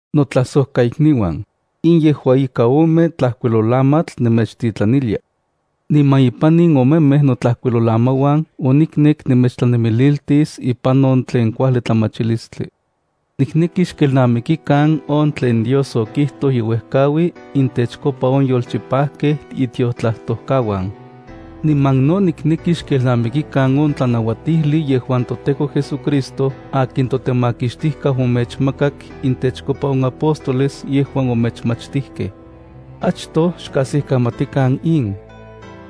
Notlajsojkaikniuan, in yejua ika ome tlajkuilolamatl nemechtitlanilia. Niman ipan in omemej notlajkuilolamauan oniknek nemechtlanemililtis ipan on tlen kuajli tlamachilistli. Nikneki xkelnamikikan on tlen Dios okijtoj ye uejkaui intechkopa on yolchipajkej itiotlajtojkauan. Niman no nikneki xkelnamikikan on tlanauatijli yejuan toTEKO JesuCristo akin toTemakixtijkau omechmakak intechkopa on apóstoles yejuan omechmachtijkej. Achtoj xkajsikamatikan in.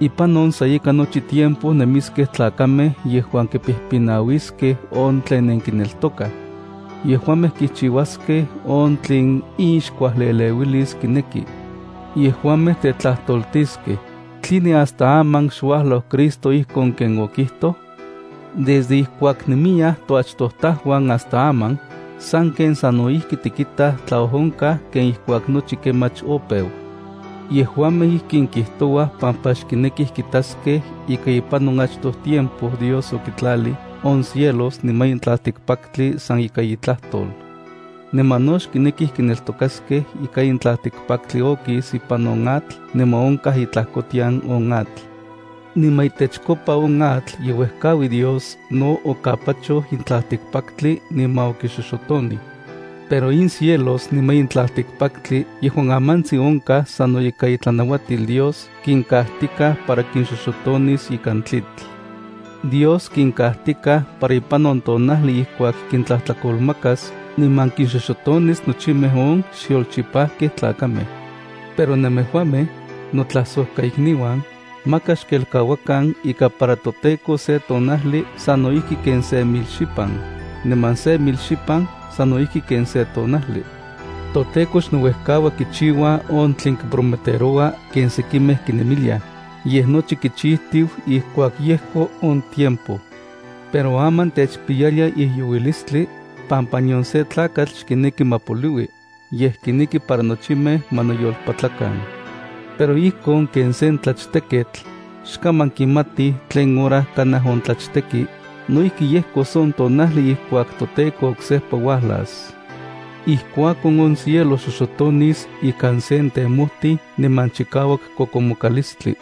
Ipan on sa ika nochi tiempo nemiskej tlakamej yejuan kipijpinauiskej on tlen nenkineltokaj. Yejuamej kichiuaskej on tlen inxkuajlieleuilis kineki. Yejuamej tetlajtoltiskej: “¿Tline hasta aman xuajlau Cristo ijkon ken okijtoj? Desde ijkuak nemiyaj toachtojtajuan hasta aman, sanken sano ijki tikitaj tlaojonkaj ken ijkuak nochi kemach opeu.” Yejuamej ijkin kijtouaj pampa xkinekij kitaskiaj ika ipan on achtoj tiempo Dios okitlalij on cielos niman in tlaltikpaktli san ika itlajtol. Niman no xkinekij kineltokaskej ika in tlaltikpaktli okis ipan on atl niman onkaj itlajkotian on atl. Niman itechkopa on atl ye uejkaui Dios no okapachoj in tlaltikpaktli niman okixoxotonij. Pero in cielos niman in tlaltikpaktli yejuan amantsin onkaj sano ika itlanauatil Dios kinkajtikaj para kinxoxotonis ikan tlitl. Dios kinkajtikaj para ipan on tonajli ijkuak kintlajtlakolmakas niman kinxoxotonis nochimej on xyolchipajkej tlakamej. Pero nemejuamej, notlajsojkaikniuan, maka xkelkauakan ika para toTEKO se tonajli sano ijki ken se mil xipan, niman se mil xipan sano ijki ken se tonajli. ToTEKO xnouejkaua kichiua on tlen prometeroua ken sekimej kinemiliaj, yej nochi kichijtiu ijkuak yejko on tiempo. Pero aman techpiyalia ijyouilistli, pampa nion se tlakatl xkineki ma poliui, yej kineki para nochimej ma noyolpatlakan. Pero ijkon ken sen tlachteketl, xkaman kimatij tlen hora kanaj ontlachteki, no ijki yejkos on tonajli ijkuak toTEKO oksejpa uajlas. Ijkuakon on cielo xoxotonis ikan sen temojtij niman chikauak kokomokalistli.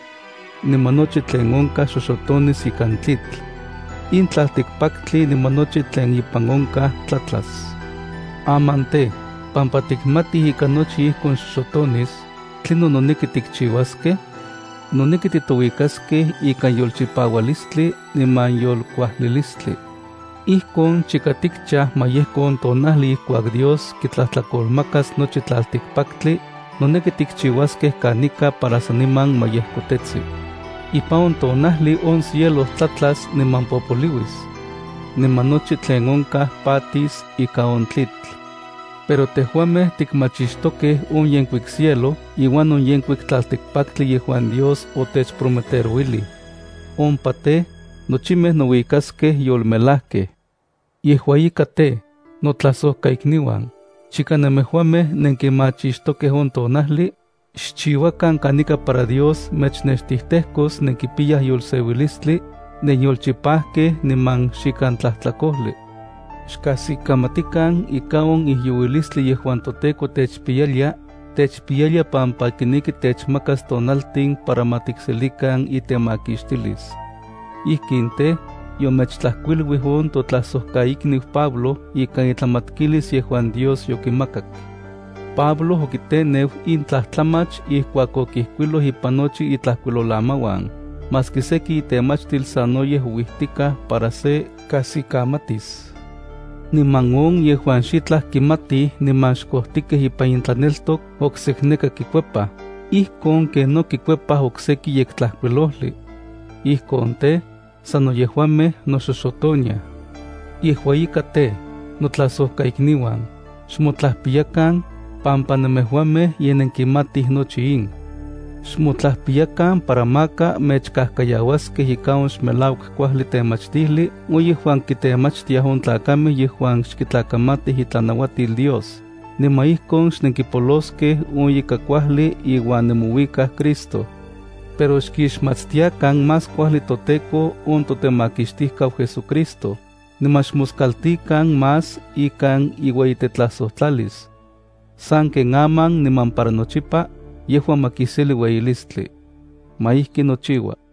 Niman nochi tlen onkaj xoxotonis ikan tlitl. In tlaltikpaktli niman nochi tlen ipan onkaj tlatlas. Aman tej, pampa tikmatij ika nochi ijkon xoxotonis, ¿tlinon noneki tikchiuaskej? Noneki titouikaskej ikan yolchipaualistli niman yolkuajlilistli. Ijkon chika tikchaj ma yejko on tonajli ijkuak Dios kitlajtlakolmakas nochi tlaltikpaktli, noneki tikchiuaskej kanika para saniman ma yejkotetsi. Ipan on tonajli on cielo tlatlas niman popoliuis. Niman nochi tlen onkaj patis ika on tlitl. Pero tejuamej tikmachixtokej on yenkuik cielo iuan on yenkuik tlaltikpaktli yejuan Dios otechprometerouilij. Ompa tej, nochimej nouikaskej yolmelajkej. Yejua ika tej, notlajsojkaikniuan, chika nemejuamej nenkimachixtokej on tonajli, xchiuakan kanika para Dios mechnextijtejkos nenkipiyaj yolseuilistli, nenyolchipajkej niman xikan tlajtlakojli. Xkajsikamatikan ika on ijyouilistli yejuan toTEKO techpiyalia, techpiyalia pampa kineki techmakas tonaltin para ma tikselikan itemakixtilis. Ijkin tej, yomechtlajkuiluij on totlajsojkaikniu Pablo ikan itlamatkilis yejuan Dios yokimakak. Pablo okiteneu in tlajtlamach ijkuak okijkuiloj ipan nochi itlajkuilolamauan, maski seki itemachtil sanoyej ouijtikaj para se kajsikamatis. Niman on yejuan xitlaj kimatij niman xkojtikej ipan intlaneltok oksekneka kikuepaj, ijkon ken no kikuepaj oksekij Yektlajkuilojli. Ijkon tej, sano yejuamej noxoxotoniaj. Yejua ika tej, notlajsojkaikniuan, xmotlajpiyakan, pampa nemejuamej ye nenkimatij nochi in. Xmotlajpiyakan para maka mechajkajkayauaskej ika on xmelauak kuajli temachtijli on yejuan kitemachtiaj on tlakamej yejuan xkitlakamatij itlanauatil Dios, niman ijkon xnenkipoloskej on ika kuajli iuan nemouikaj Cristo. Pero xkixmatstiakan más kuajli toTEKO on toTemakixtijkau JesuCristo, niman xmoskaltikan más ikan iueyitetlajsojtlalis. Sanken aman niman para nochipa, yejua ma kiseli ueyilistli. Ma ijki nochiua.